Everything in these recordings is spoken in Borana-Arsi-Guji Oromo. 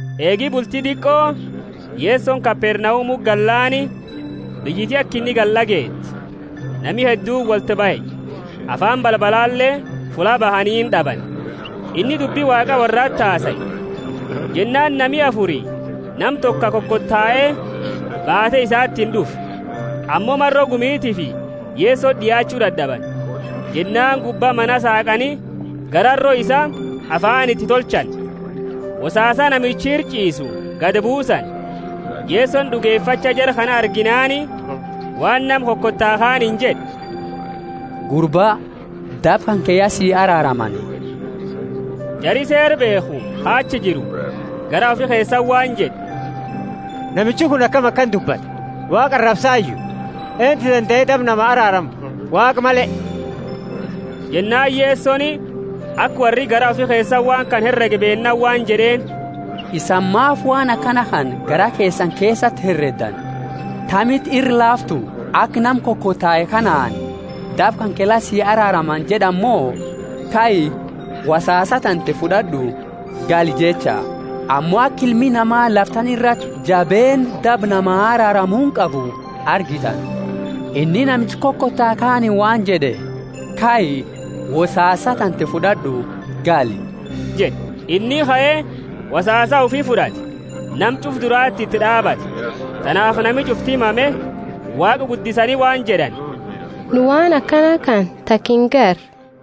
Eegi bulti diqo, Yesoni Kapernaumuti gallaani, biyyiti aka inni gale d'ageete. Nami hedduuni wolti bahe, afaani balbalale fulla bahaniini d'abani. Inni dubbi Waaqa worrati hasae. Jennaani nami afuri nama toko ka kokotae baate isatiini d'ufe. Ammo maro gumitiifi Yesoti d'iaachu dad'abani. Jennaani gubba mana saaqani gararo isaa, afaani iti tolchani, wosaasa namichi ira ch'iisu gadi buusani. Yesoni d'ugefacha jara kana arginaani, waan nama kokotae kaaniini jed'e, Gurba, daba kanke ya si araaramani. Jari Seera beekhu ka achi jiru garaa ufi keesati waan jed'e, Namichi kuni akami akana dubbata? Waaqa arabsayu? Eentu dandae daba nama araarama, Waaqa male? Jennaani Yesoni aka worri garaa ufi keesati waan kana heregu beennaani waan jed'eeni, Isani maafi waan akana kana garaa keesani keesati hereddani? Tamiti ira laaftu, aka nama kokotae kanaani, Daba kanke la si araaramani jed'ani mo, Kai, wosaasa tante fud'ad'u, gali jecha? Ammo aka Ilmi Nama lafa tana irati jabeenna daba nama araaramuuni qabu argitani, inni namicha kokotae kaaniini waan jed'e, Kai, wosaasa tante fud'ad'u, gali jed'e. Inni kae, wosaasa ufi fud'ate, nama ch'ufa durati iti d'aabate. Tanaafi nami ch'ufti mame, Waaqa guddisani waan jed'ani, Nu waan akana kana taka ingarre.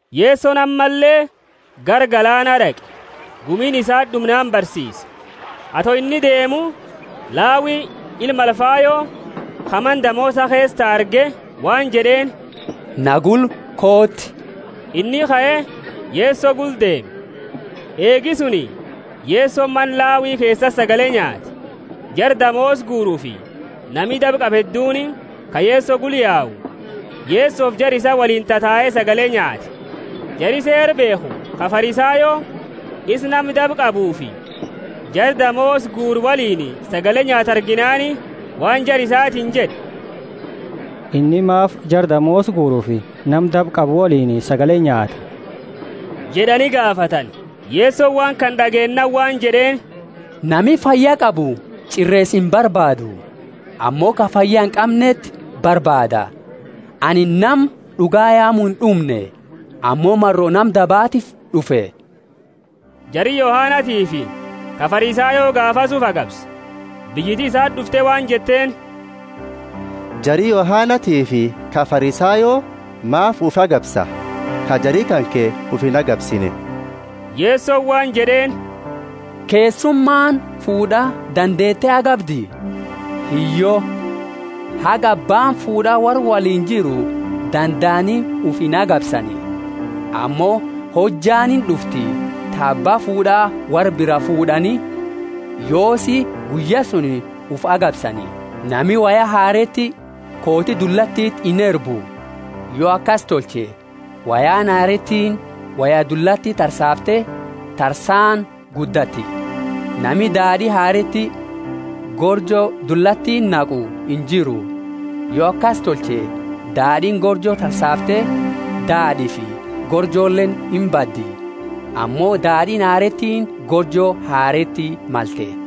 Yesoni ammalle gara galaana d'aqe, gumiini isati d'umnaani barsiise. Ato inni deemu, Lawi, ilma Alfayo, ka mana damoosa keesa tau arge waan jed'eeni, Na gula kooti. Inni kae, Yeso gula deeme. Eegi suni Yesoni mana Lawi keesati sagale nyaate. Jara damoosa guurufi nami daba qabu hedduuni, ka Yeso gula yau, Yesofi jara isaa woliini tatae sagale nyaate. Jari Seera beekhu ka Farisayo, isa nama daba qabuufi jara damoosa guuru woliini sagale nyaatu arginaani, waan jara isatiini jed'e, Inni maafi jara damoosa guurufi nama daba qabu woliini sagale nyaata? jed'ani gaafatani. Yesoni waan kana d'ageennaani waan jed'eeni, Nami fayyaa qabu ch'ireesa imbarbaadu, ammo ka fayya inqamneti barbaadata. Anini nama d'uga yaamu ind'umne, ammo maro nama dabaatiifi d'ufe. Jari Yohanatiifi ka Farisayo gaafasi ufi agabsa. Biyyiti isati d'ufte waan jetteeni, Jari Yohanatiifi ka Farisayo maafi ufi agabsa, ka jari kanke ufi inagabsine? Yesoni waan jed'eeni, Keessumaani fuud'a dandeete agabdi? Hiyyo. Haga abbaani fuud'a worra woliini jiru dandaani ufi inagabsani. Ammo hojjaani ind'ufti, ta abba fuud'a worra biraa fuud'ani, yoosi guyya suni ufi agabsani. Nami woya hareeti kooti dullatiti inerbu. Yo akasi tolche, woyaani hareetiini woya dullati tarsaafte tarsaani guddatti. Nami daad'i hareeti gorjo dullatiti naqu injiru. Yo akasi tolche, daad'iini gorjo tarsaafte, daad'iifi gorjoleeni imbaddi. Ammo daad'iini hareetiini gorjo hareeti malte.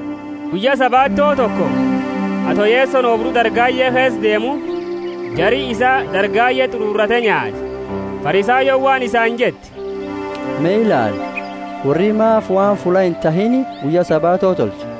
Guyya Sabato toko, ato Yesoni oobru dargaye keesa deemu, jari isaa dargaye t'ururate nyaate. Farisayooni waan isaani jette, Me ilaali, worri maafi waan fulla intahiini guyya Sabato tolcha?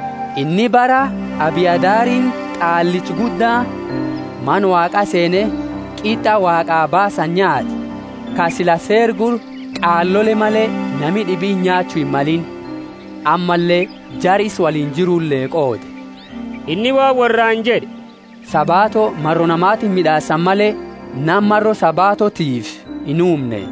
Inni bara Abiatharini qaallicha gudda, Mana Waaqa seene qit'a Waaqa baasani nyaate, ka sila Seera gula qaalole male nami d'ibiini nyaachu himmalini; ammalle jara isa woliini jirule qoode. Inni waan worraani jed'e, Sabato maro namatiifi mid'aasani male, nama maro Sabatotiifi inuumne.